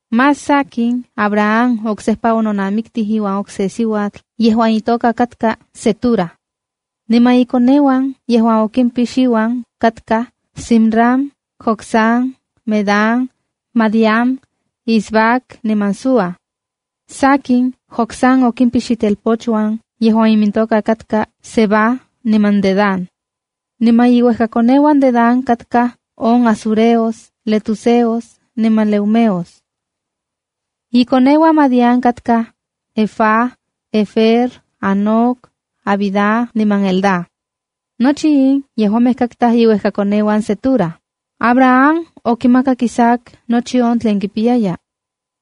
Más sakin, Abraham oksejpa ononamiktij iuan okse siuatl yejuan itoka katka Cetura. Niman ikoneuan yejuan okimpix iuan, katkaj: Zimram, Jocsán, Medán, Madián, Isbac niman Súa. Sakin, Jocsán okimpix itelpochuan yejuan imintoka katkaj Seba niman Dedán. Niman iuejkakoneuan Dedán katkaj on asureos, letuseos niman leumeos. Ikoneuan Madián katkaj Efa, Efer, Hanoc, Abida niman Elda. Nochi in yejuamej katkaj iuejkakoneuan Cetura. Abraham okimakak Isaac nochi on tlen kipiyaya.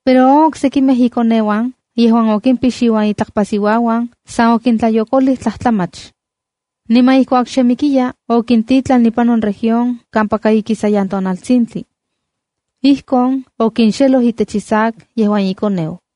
Pero on oksekimej ikokneuan yejuan okimpix iuan itlakpasiuauan san okintlatlayokolij tlajtlamach. Niman ijkuak xe mikiya, okintitlan ipan on región kampaka ikisayan tonaltsintli. Ijkon okinxeloj itech Isaac yejuan ikoneu.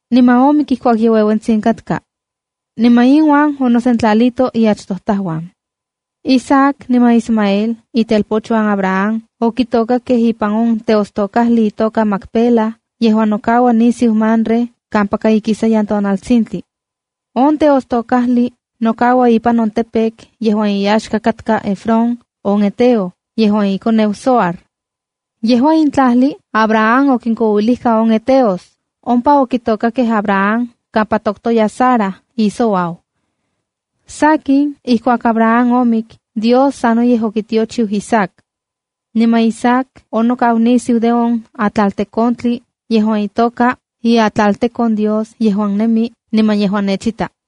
niman omik ijkuak ye ueuentsitsin katka. Niman inuan onosentlalito iachtojtajuan. Isaac niman Ismael, itelpochuan Abraham, okitokakej ipan on teostokajli itoka Macpela yejuan nokaua nisiu Mamre kampaka ikisayan tonaltsintli. On teostokajli nokaua ipan on campo yejuan iyaxka katka Efrón on heteo, yejuan ikoneu Zohar. Yejua in tlajli Abraham okinkouilijka on heteos. Ompa okitokakej Abraham kampa toktokya Sara on isiuau. Sakin, ijkuak Abraham omik, Dios sanoyej okitiochiu Isaac. Niman Isaac onokau nisiu de on atlaltekontli yejuan itoka “Iatlaltekon Dios yejuan nemi niman yejuan nechita.”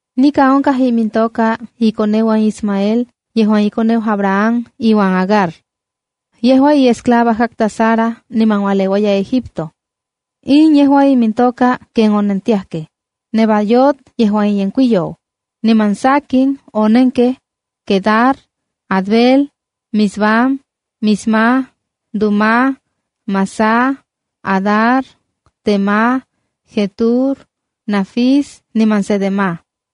Nikan onkaj imintoka ikoneuan Ismael yejuan ikoneu Abraham iuan Agar. Yejua iesclava katka Sara niman ualeuaya Egipto. In yejua imintoka ken onentiajkej: Nebaiot, yejuan iyenkuiyou, niman sakin, onenkej Quedar, Adbeel, Mibsam, Misma, Duma, Massa, Hadar, Tema, Jetur, Nafis niman Cedema.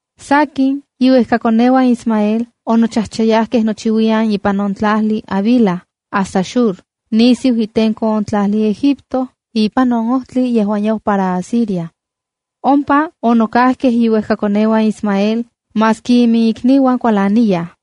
Sakin, iuejkakoneuan Ismael onochajchayajkej nochiuiyan ipan on tlajli Havila hasta Shur nisiu itenko on tlajli Egipto ipan on ojtli yejuan yau para Asiria. Ompa onokajkej iuejkakoneuan Ismael maski iminikniuan kualaniyaj.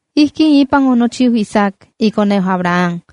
Ijkin ipan onochiu Isaac, ikoneu Abraham.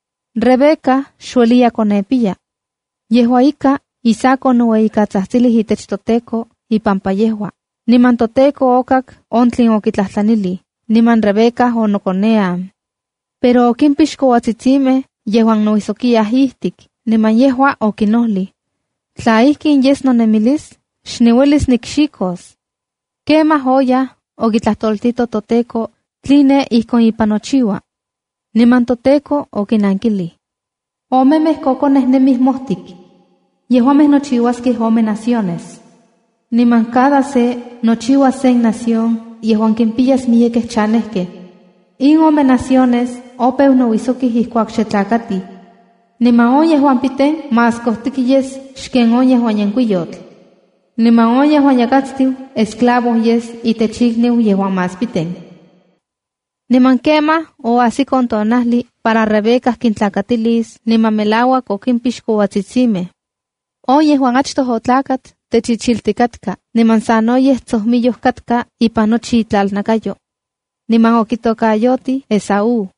Rebeca xueliya konepiya. Yejua ika, Isaac onoueyikatsajtsilij itech toTEKO ipampa yejua, niman toTEKO okak on tlen okitlajtlanij, niman Rebeca onokonean. Pero okimpix kouatsitsimej yejuan nouijsokiyaj ijtik, niman yejua okinojlij: “Tla ijkin yes nonemilis, xniuelis nikxijkos.” Kemaj oyaj okitlajtoltito toTEKO tline ijkon ipan nochiua. Niman toTEKO okinankilij: “Omemej kokonej nemij mojtik. Yejuamej nochiuaskej ome naciones. Niman cada se nochiuas sen nación yejuan kimpiyas miyekej chanejkej. In ome naciones opeu nouisokij ijkuak xe tlakatij. Niman on yejuan piten más kojtik yes xken on yejuan yenkuiyotl. Niman on yejuan yakatstiu esclavo yes itech ikniu yejuan más piten.” Niman kemaj oajsik on tonajli para Rebeca kintlakatilis, niman melauak okimpix kouatsitsimej. On yejuan achtoj otlakat, techijchiltik katka niman sanoyej tsojmiyoj katka ipan nochi itlalnakayo. Niman okitokayotijkej Esaúa.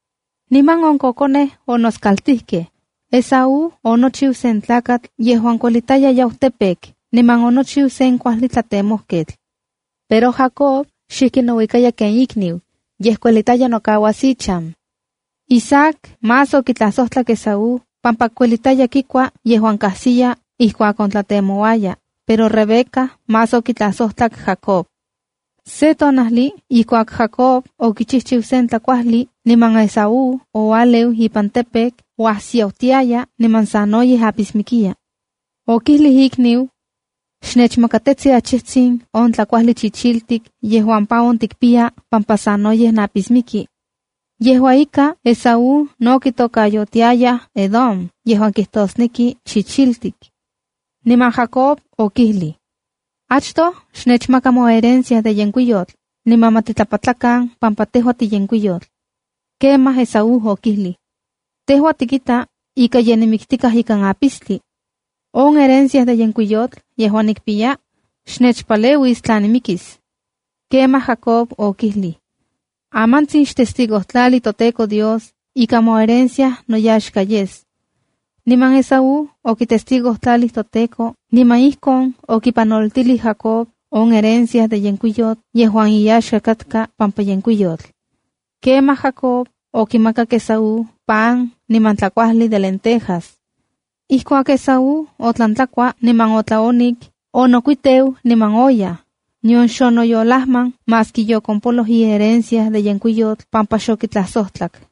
Niman on kokonej onoskaltijkej. Esaú onochiu sen tlakatl yejuan kuelitaya yau campo, niman onochiu sen kuajli tlatemojketl. Pero Jacob xikij nouika ken ikniu, yej kuelitaya nokauas ichan. Isaac más okitlajsojtlak Esaú pampa kuelitaya kikua yejuan kajsiya ijkuak ontlatemouaya, pero Rebeca más okitlajsojtlak Jacob. Se tonajli ijkuak Jacob okichijchiu sen tlakuajli, niman Esaú oualeu ipan campo, uajsiautiaya niman sanoyej apismikiya. Okijlij ikniu: —Xnechikneli. Xnechmakatetsi achijtsin on tlakuajli chichiltik yejuan pa on tikpiya pampa sanoyej napismiki. (Yejua ika, Esaú no kitokayotiayaj Edom yejuan kijtosneki “chichiltik”.) Niman Jacob okijlij: —Achtoj xnechmaka moherencia de yenkuiyotl niman ma titlapatlakan pampa tejua tiyenkuiyotl. Kemaj Esaú okijlij: —Tejua tikita ika ye nimiktikaj ikan apistli. On herencia de yenkuiyotl yejuan nikpiya, xnechpaleuis tla nimikis. Kemaj Jacob okijlij: —Amantsin Xtestigojtlali toTEKO Dios ika moherencia noyaxka yes. Niman Esaú okitestigojtlalij toTEKO niman ijkon okipanoltilij Jacob on herencia de yenkuiyotl yejuan iyaxka katka pampa yenkuiyotl. Kemaj Jacob okimakak Esaú pan niman tlajkuajli de lentejas. Ijkuak Esaú otlan tlakua niman otlaonik, onokuiteu niman oyaj, nion xonoyolajman maski yokompoloj iherencia de yenkuiyotl pampa xokixtlajsojtlak.